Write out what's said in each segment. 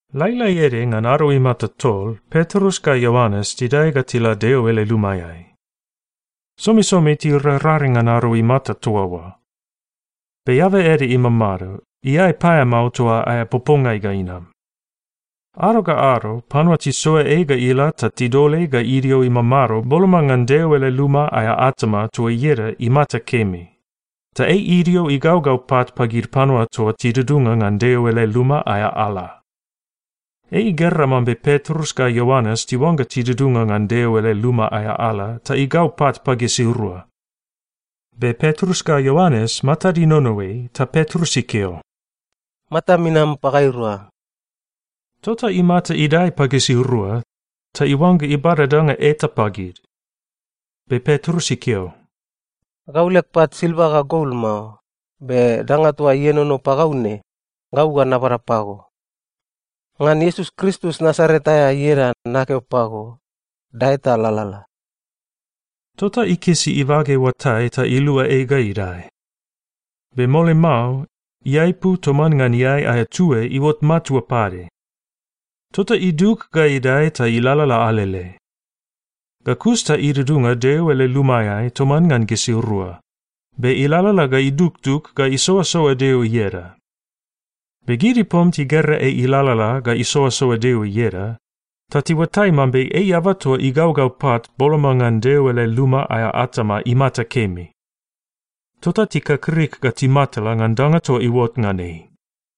Lailai ede ngan ado imata tol, Petrus ga Ioanes tidae ga tila Deo ele lumaeai. Somisomi tirararing ngan ado imata toa oa. Be eaba ede imamado, iae paeamao toa aea popongai ga inam. Ado ga ado panua tisoa ei ga ila ta tidol ei ga idio imamado boloma ngan Deo ele luma aea atama toa ieda Imata Kemi, ta ei idio igaugau pat pagid panua toa tidudunga ngan Deo ele luma aea ala. Ei igera mambe Petrus ga Ioanes tiuangga tidudunga ngan Deo ele luma aea ala ta igau pat pagisirua. Be Petrus ga Ioanes matad inono ei, ta Petrus ikeo, “Matam inam pagairua.” Tota imata idae pagisirua, ta iuangga ibada danga eta pagid. Be Petrus ikeo, “Gau leg pat silva ga gol mao, be danga toa ienono pagau ne, gau ga nabada pago. Ngan Iesus Kristus Nasaret aea ieda nakeo pago, dae ta lalala!” Tota ikisi ibage oatai ta ilua ei ga idae. Be mole mao, iaepu toman ngan iae aea tue iuot matua pade. Tota idug ga idae ta ilalala alele. Ga kus ta idudunga Deo ele lumaeai toman ngan gisirua, be ilalala ga idugdug ga isoasoa Deo ieda. Be gid ipom tigera ei ilalala ga isoasoa Deo ieda, ta tiuatai mambe ei eaba toa igaugau pat boloma ngan Deo ele luma aea atama Imata Kemi. Tota tikakrik ga timatala ngan danga toa iuot ngan ei.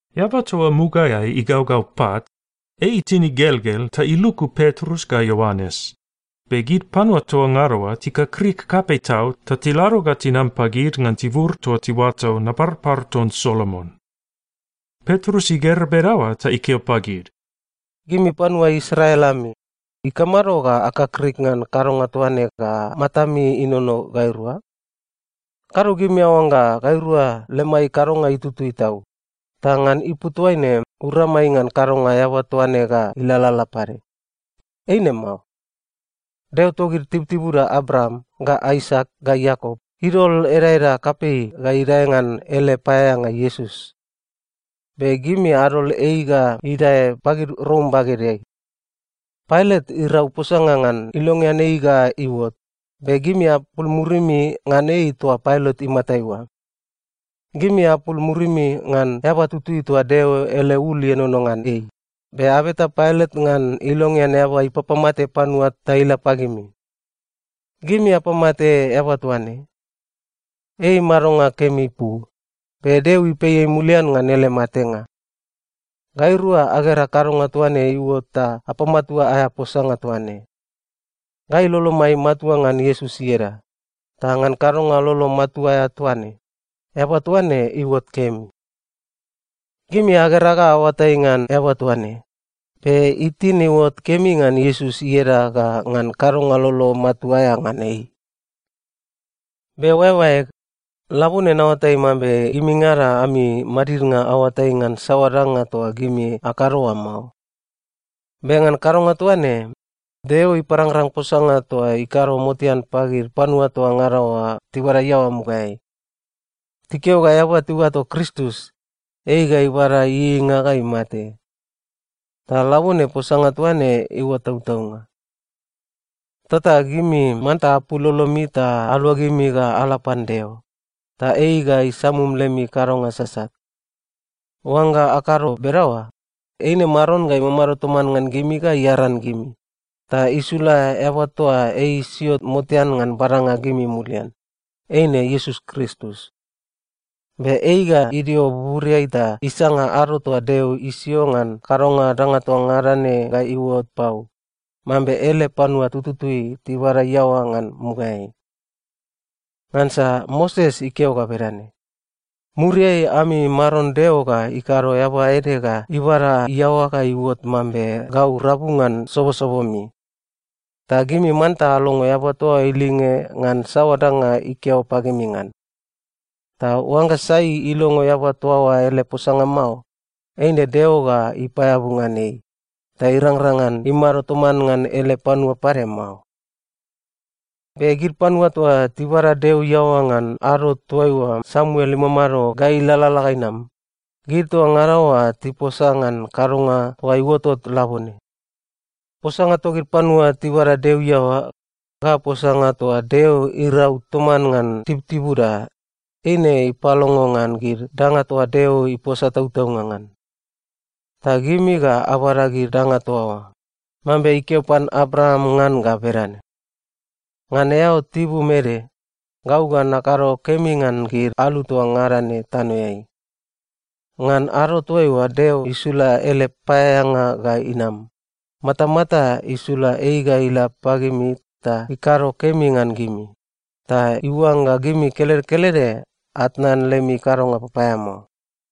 Eaba toa mugaeai igaugau pat, ei itin igelgel ta iluku Petrus ga Ioanes, be gid panua toa ngada oa tikakrik kapei tau ta tilado ga tinam pagid ngan tibur toa tiuato Naparpar ton Solomon. Petrus igera bedaoa ta ikeo pagid, “Gimi panua Israel ami, ikamado ga akakrik ngan kadonga toa ne ga matami inono gairua? Kado gimi aoangga gairua lemai kadonga itutui tau, ta ngan ipu toaine uramai ngan kadonga eaba toa ne ga ilalala pade. Eine mao. Deo togid tibutibuda Abraam, ga Aisak, ga Iakop idol edaeda kapei ga idae ngan ele paeaeanga Iesus. Be gimi adol ei ga idae pagid Rom bagedeai. Pailat irau posanga ngan ilongean ei ga iuot, be gimi apul murimi ngan ei toa Pailat imatai oa. Gimi apul murimi ngan eaba tutui toa Deo ele ul ienono ngan ei, be abeta Pailat ngan ilongean eaba ipapamate panua ta ila pagimi. Gimi apamate eaba toa ne. Ei madonga kemi ipu, be Deo ipei ei mulian ngan ele matenga. Gairua agera kadonga toa ne iuot ta apamatua aea posanga toa ne. Gai lolomai matua ngan Iesus ieda, ta ngan kadonga lolo matua aea toa ne, eaba toa ne iuot kemi. Gimi agera ga aoatai ngan eaba toa ne, be itin iuot kemi ngan Iesus ieda ga ngan kadonga lolo matua aea ngan ei. “Be oaeoaeg, labone naoatai mambe gimingada ami madidnga aoatai ngan saoa danga toa gimi akado oa mao. Be ngan kadonga toa ne, Deo iparangrang posanga toa ikado motean pagid panua toa ngada oa tibada iaoa mugaeai. Tikeo ga eaba tiuato Kristus, ei ga ibada ieieinga ga imate. Ta labone posanga toa ne iuot tautaunga. Tota gimi manta apul lolomi ta aluagimi ga ala pan Deo, ta ei ga isamum lemi kadonga sasat. Oangga akado bedaoa, eine Maron ga imamado toman ngan gimi ga iaran gimi, ta isula eaba toa ei isio motean ngan badanga gimi mulian, eine Iesus Kristus. Be ei ga idio buburiai ta isanga ado toa Deo isio ngan kadonga danga toa ngada ne ga iuot pau, mambe ele panua tututui tibada iaoa ngan mugaeai. Ngansa Moses ikeo ga bedane, ‘Muriai, ami Maron Deo ga ikado eaba ede ga ibada iaoa ga iuot mambe gau rabu ngan sobosobomi. Ta gimi manta alongo eaba toa oa ilinge ngan saoa danga ikeo pagimi ngan. Ta oangga sai ilongo eaba toa oa ele posanga mao, eine Deo ga ipaeabu ngan ei, ta irangrang ngan imado toman ngan ele panua pade mao.’ “Be gid panua toa tibada Deo iaoa ngan ado toaiua Samuel imamado ga ilalala ga inam, gid toa ngada oa tiposa ngan kadonga toa iuotot labone. Posanga togid panua tibada Deo iaoa, ga posanga toa Deo irau toman ngan tibutibuda, eine ipalongo ngan gid danga toa Deo iposa tautaunga ngan. Ta gimi ga abada gid danga toa oa, mambe ikeo pan Abraam ngan ga bedane, ‘Ngan eao tibum ede, gau ga nakado kemi ngan gid alu toa ngada ne tanoeai.’ Ngan ado toaiua Deo isula ele paeaeanga ga inam, matamata isula ei ga ila pagimi ta ikado kemi ngan gimi, ta iuangga gimi kelede kelede atnan lemi kadonga papaeamao.”